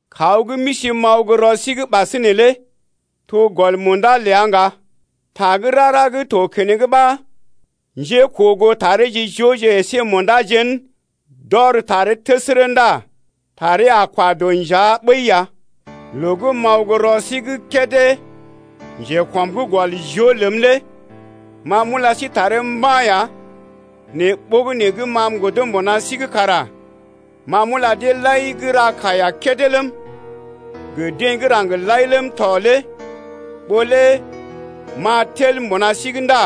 Kaw gə́ m’isi m’aw gə́ rɔ sí’g ɓasinè lé to gɔl munda ləa ŋga. Ta gə́ rara gə́ to keneŋ ɓa njékoogootareje jooje əsé munda jén d’ɔr taree təsərə ndá taree a kwa dɔ njea ɓəi ya. Loo gə́ m’aw gə́ rɔ sí’g kédé njekɔm’g gɔl joo ləm lé ma m’ula sí taree mba̰ ya nɛ ɓogənè gə́ ma m’godo mbuna sí’g kara ma m’ula deḛ lai gə́ ra kaiya kédé ləm, gə deḛ gə́ raŋg lai ləm tɔ lé ɓó lé m’a tel mbuna sí’g ndá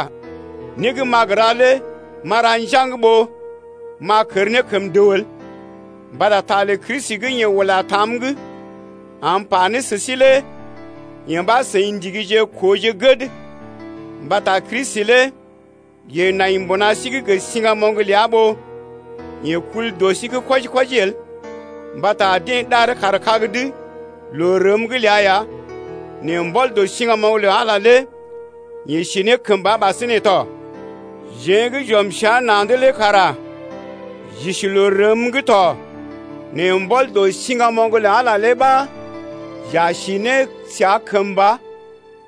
né gə́ m’a gə ra lé m’a ra njaŋg ɓó m’a kər ne kəm dəw el. Mbata ta lə Kristi gə́ yeḛ ula tam’g am m’pa ne sə sí lé yee ɓa seḭ ndigije kooje gəd, mbata Kristi lé yeḛ nai mbuna sí’g gə siŋgamoŋ ləa ɓó yeḛ kul dɔ sí’g kwɔji-kwɔji el. Mbata deḛ ɗaree kaar kag’d loo rəm’g ləa ya nɛ mbɔl dɔ siŋgamoŋ lə Ala lé yeḛ si ne kəmba ɓasinè tɔ. Jeḛ gə́ j’ɔm səa na̰’d lé kara j’isi loo rəm’g to nɛ mbɔl dɔ siŋgamoŋ lə Ala lé ɓa j’a si ne səa kəmba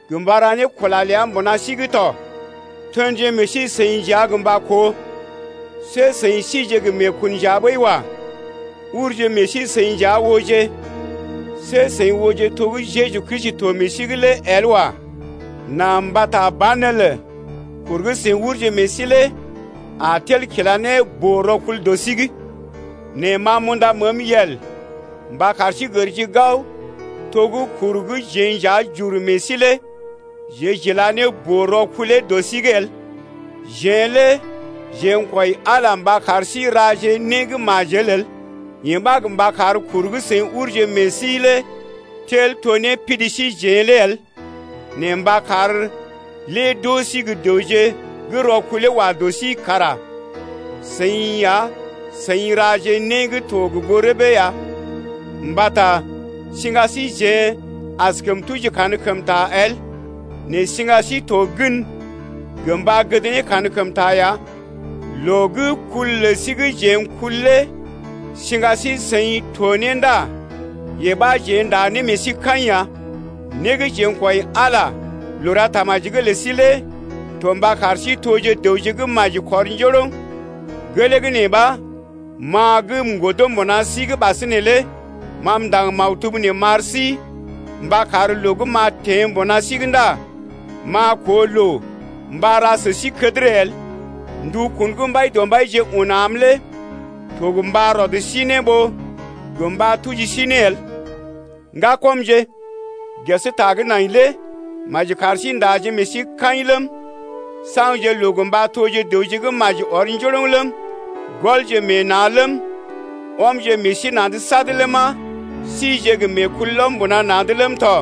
gə mba ra ne kula ləa mbuna sí’g tɔ. Tenje meḛ sí-seḭ nja gə mba koo, see seḭ síje gə meekun nja ɓəi wa. Urje meḛ sí seḭ nja ooje. See seḭ ooje to gə́ Jeju Kristi to meḛ sí’g lé el wa. Nà mbata banelə kur gə́ seḭ urje meḛ sí lé a tel kila ne boo-rɔkul dɔ sí’g. Nɛ ma m’unda məəm yel mba kar sí gərje gao to gə́ kur gə́ jeḛ nja j’ur meḛ síjeḛ lé jeḛ j’ila ne boo-rɔkulee dɔ sí’g el. Jeḛ lé jeḛ n’kwɔi Ala mba kar sí raje né gə́ majel el. Yee ɓa gə mba kar kur gə́ seḭ urje meḛ sí lé tel to né pidi síjeḛ lé el nɛ mba kar lé d’oo sí gə́ dəwje gə́ rɔkulee wa dɔ sí’g kara seḭ ya seḭ raje ne né gə́ to gə goo rəbee ya. Mbata siŋga síjeḛ askəm tuji kankəmta el, nɛ siŋga sí to gən gə mba gəd ne kankəmta ya. Loo gə́ kul lə sí gə́ jeḛ n’kul lé siŋga sí-seḭ to ne ndá yee ɓa jeḛ ndá ne meḛ sí kaḭ ya. Né gə́ jeḛ n’kwɔi Ala loo ra tamaji’g lə sí lé to mba kar sí toje dəwje gə́ maji kɔr njoroŋ. Gelee gə́ nee ɓa, ma gə́ m’godo mbuna sí’g ɓasinè lé ma m’ndaŋg maktub nee m’ar sí mba kar loo gə́ m’a teḛ mbuna sí’g ndá m’a koo loo mba ra sə sí kədərə el, ndukun gə́ Mbaidɔmbaije un am lé to gə mba rɔd sí ne ɓó gə mba tuji sí ne el. Ŋgakɔmje, ges ta gə́ nai lé maji kar sí ndaje meḛ sí kaḭ ləm, saŋgje loo gə mba toje dəwje gə́ maji ɔr njoroŋ ləm, gɔlje meḛ na̰ ləm, ɔmje meḛ sí na̰’d sad ləma, sije gə meekulɔm mbuna na̰’d ləm tɔ,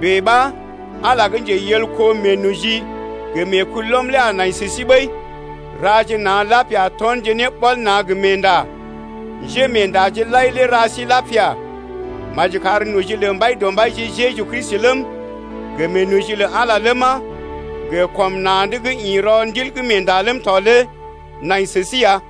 bèe ɓa, Ala gə́ njeyelko meenoji gə meekulɔm lé a nai sə sí ɓəi. Raje na̰ lapia tɔnje ne ɓɔl na̰ gə meenda. Njémeendaje lai lé ra sí lapia tɔ. Maji kar noji lə Mbaidɔmbaije Jeju Kristi ləm gə meenoji lə Ala ləma gə kɔm na̰’d gə́ ḭ rɔ Ndilmeenda’g ləm tɔ lé nai sə si ya.